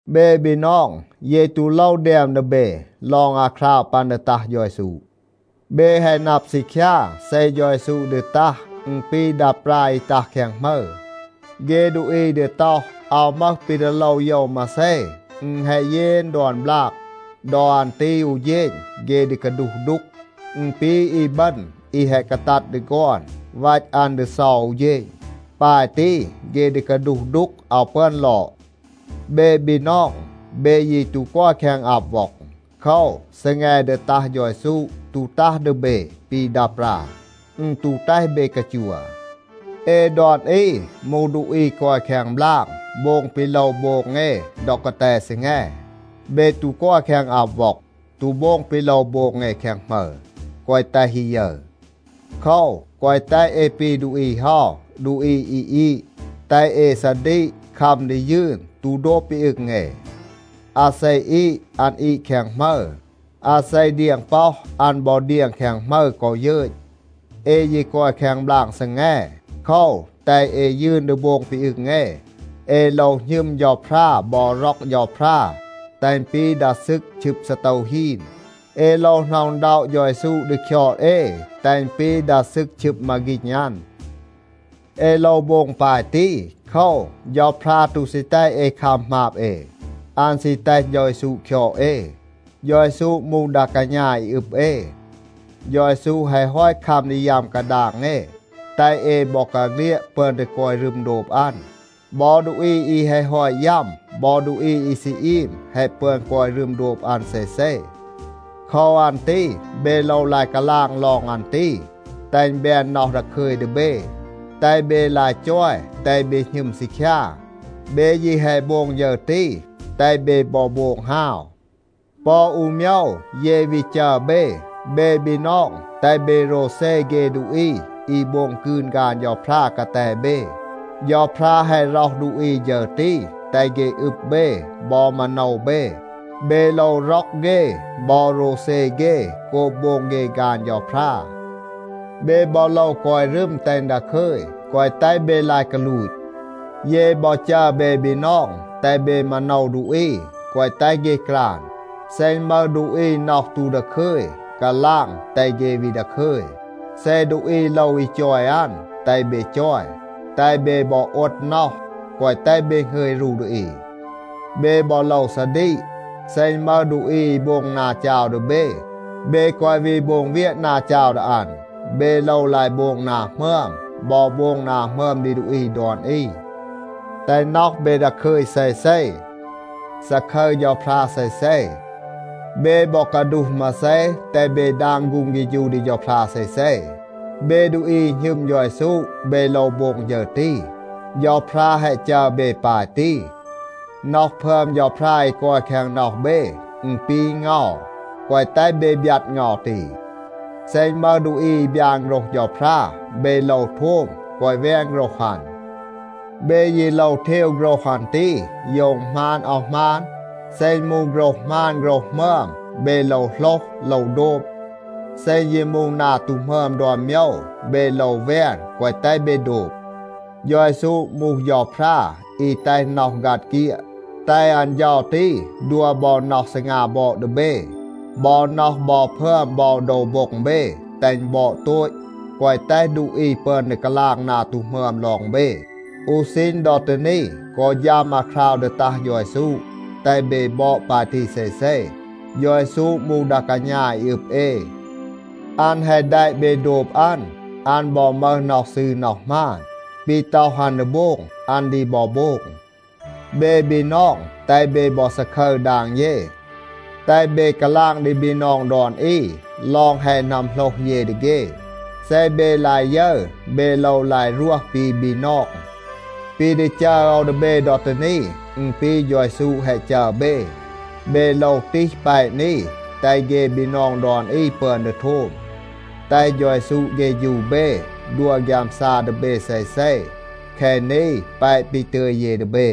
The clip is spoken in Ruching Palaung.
เบ บีนอง, เย ตู โลว แดม ดี เบ ลอง อาคราว ปัน ดี ตัห เฌา เยซู. เบ แฮะ นับ ซีคยา, เซ เฌา เยซู ดี ตัห, อึณ ปี ดา ปรา อี ตัห แคง หมึร. เฆ ดูอี ดี ต็อห, “อาว มึห ปี ดี โลว โยว มาเซ, อึณ แฮะ เยน ดอน บลาก.” ดอ อัน ตี อู เฌณ เฆ ดี กาดูห ดูก. อึณ ปี อีบึณ อี แฮะ กาตัด ดี ฆอน. วัต อัน ดี เซา อู เฌณ. ปาย ตี เฆ ดี กาดูห ดูก, อาว ปึอน ลอด. เบ บีนอง, เบ ยี ตู กอย แคง อับ ว็อง. โคว, ซีแง ดี ตัห เฌา เยซู ตู ตัห ดี เบ ปี ดา ปรา. อึณ ตู แตห เบ กาจัว. เอ ดอน อี มูห ดูอี กอย แคง บลาง, โบง ปี โลว โบง เอ ดอ กาแต ซีแง. เบ ตู กอย แคง อับ ว็อง, ตู โบง ปี โลว โบง เอ แคง หมึร, แกวะ แตห อี ยึร. โคว, แกวะ แตห เอ ปี ดูอี เฮา, ดูอี อี อีด. แตห เอ ซาดีก, คัม ดี ยืน, ตู โดบ ปี อึง เอ. อาเซ อีด, อัน อีด แคง หมึร. อาเซ เดียง ป็อห, อัน บอ เดียง แคง หมึร กอ ยึต. เอ ยี กอย แคง บลาง ซีแง. โคว, แตห เอ ยืน ดี โบง ปี อึง เอ. เอ โลว หณึม เฌาพรา บอ ร็อก เฌาพรา, แตห อึณ ปี ดา ซึก ชึบ ซีโตว ฮีน. เอ โลว หน็อะ อึณด็อะ เฌา เยซู ดี คยอด เอ, แตห อึณ ปี ดา ซึก ชึบ มาฆีณ อัน. เอ โลว โบง ปาย ตี, โคว, เฌาพรา ตู ซี แตห เอ คัม หมาบ เอ. อัน ซี แตห เฌา เยซู คยอด เอ. เฌา เยซู มูห ดา กาณา อี อึบ เอ. เฌา เยซู แฮะ ฮอต คัม ดี ยัม กาดาง เอ, แตห เอ บอกาเฆลียด ปึอน ดี กอย รึม โดบ อัน. บอ ดูอี อี แฮะ ฮอต ยัม, บอ ดูอี อี ซี อีม แฮะ ปึอน กอย รึม โดบ อัน เซเซ. โคว อัน ตี เบ โลว ลาย กาลาง ลอง อัน ตี, แตห อึณ แบน น็อห ดาคึย ดี เบ. แตห เบ ลาย จอย, แตห เบ หณึม ซีคยา. เบ ยี แฮะ โบง ฌึร ตี. แตห เบ บอ โบง ฮาว. ปอ อู โมยว เย วี จัร เบ. เบ บีนอง, แตห เบ โรวเซ เฆ ดูอี อี โบง กืน ฆาน เฌาพรา กาแต เบ. เฌาพรา แฮะ ร็อห ดูอี ฌึร ตี, แตห เฆ อึบ เบ, บอ มาโนว เบ. เบ โลว ร็อก เฆ บอ โรวเซ เฆ โกบ โบง เฆ ฆาน เฌาพรา. เบ บอ โลว กอย รึม แตห อึณ ดาคึย, แกวะ แตห เบ ลาย กาลูต. เย บอ จัร เบ บีนอง, แตห เบ มาโนว ดูอี, แกวะ แตห เฆ กราน. เซ อึณ มึห ดูอี น็อห ตู ดาคึย, กาลาง, แตห เฆ วี ดาคึย. เซ ดูอี โลว อี จอย อัน, แตห เบ จอย. แตห เบ บอ โอด น็อห, แกวะ แตห เบ หงึย รู ดี อี. เบ บอ โลว ซาดีก. เซ อึณ มึห ดูอี อี โบง นา จาว ดี เบ, เบ แกวะ วี โบง เวียะ นา จาว ดี อัน. เบ โลว ลาย โบง นา หมึอม, บอ โบง นา หมึอม ดี ดูอี ดอน อี. แตห น็อห เบ ดาคึย เซเซ. ซาคึร เฌาพรา เซเซ. เบ บอ กาดูห มาเซ, แตห เบ ดาง ฆูง เฆฌู ดี เฌาพรา เซเซ. เบ ดูอี อี หณึม เฌา เยซู, เบ โลว โบง ฌึร ตี. เฌาพรา แฮะ จัร เบ ปาย ตี. น็อห พึอม เฌาพรา อี กอย แคง น็อห เบ, อึณ ปี เงา. แกวะ แตห เบ บยัด เงา ตี. เซ อึณ มึห ดูอี อี บยาน โฆรห เฌาพรา, เบ โลว โทม. แกวะ แวน โฆรห อัน. เบ ยี โลว เทว โฆรห อัน ตี, โยว อึณ หมาน อาว หมาน. เซ อึณ มูห โฆรห หมาน โฆรห หมึอม, เบ โลว โหลห, โลว โดบ. เซ อึณ ยี มูห นา ตู หมึอม ดอน โมยว, เบ โลว แวน, แกวะ แตห เบ โดบ. เฌา เยซู มูห เฌาพรา อี แตห น็อห ฆัด เฆียด. แตห อัน เฌา ตี ดัว บอ น็อห ซีงา บอด ดี เบ. บอ น็อห บอ พึอม บอ โดว โบ็ง เบ, แตห อึณ บอด โตต, แกวะ แตห ดูอี ปึอน ดี กาลาง นา ตู หมึอม ลอง เบ. อู ซีณ ดอ ตี นี กอ ฌัม อาคราว ดี ตัห เฌา เยซู, แตห เบ บอด ปาย ตี เซเซ. เฌา เยซู มูห ดา กาณา อี อึบ เอ. อัน แฮะ แดะ เบ โดบ อัน. อัน บอ มึห น็อห ซืร น็อห หมาน. ปี ต็อห อัน ดี โบง, อัน ดี บอ โบง. เบ บีนอง, แตห เบ บอ ซาคึร ดาง เย. แตห เบ กาลาง ดี บีนอง ดอน อี ลอง แฮะ นัมโหลห เย ดี เฆ. เซ เบ ลาย ยึร เบ โลว ลาย รวห ปี บีนอง. ปี ดี จัร โอว ดี เบ ดอ ตี นี, อึณ ปี เฌา เยซู แฮะ จัร เบ. เบ โลว ตีห แปะ นี, แตห เฆ บีนอง ดอน อี ปึอน ดี โทม. แตห เฌา เยซู เฆฌู เบ, ดัว ฆยามซา ดี เบ เซเซ. แคะ นี แปะ ปี ตึย เย ดี เบ.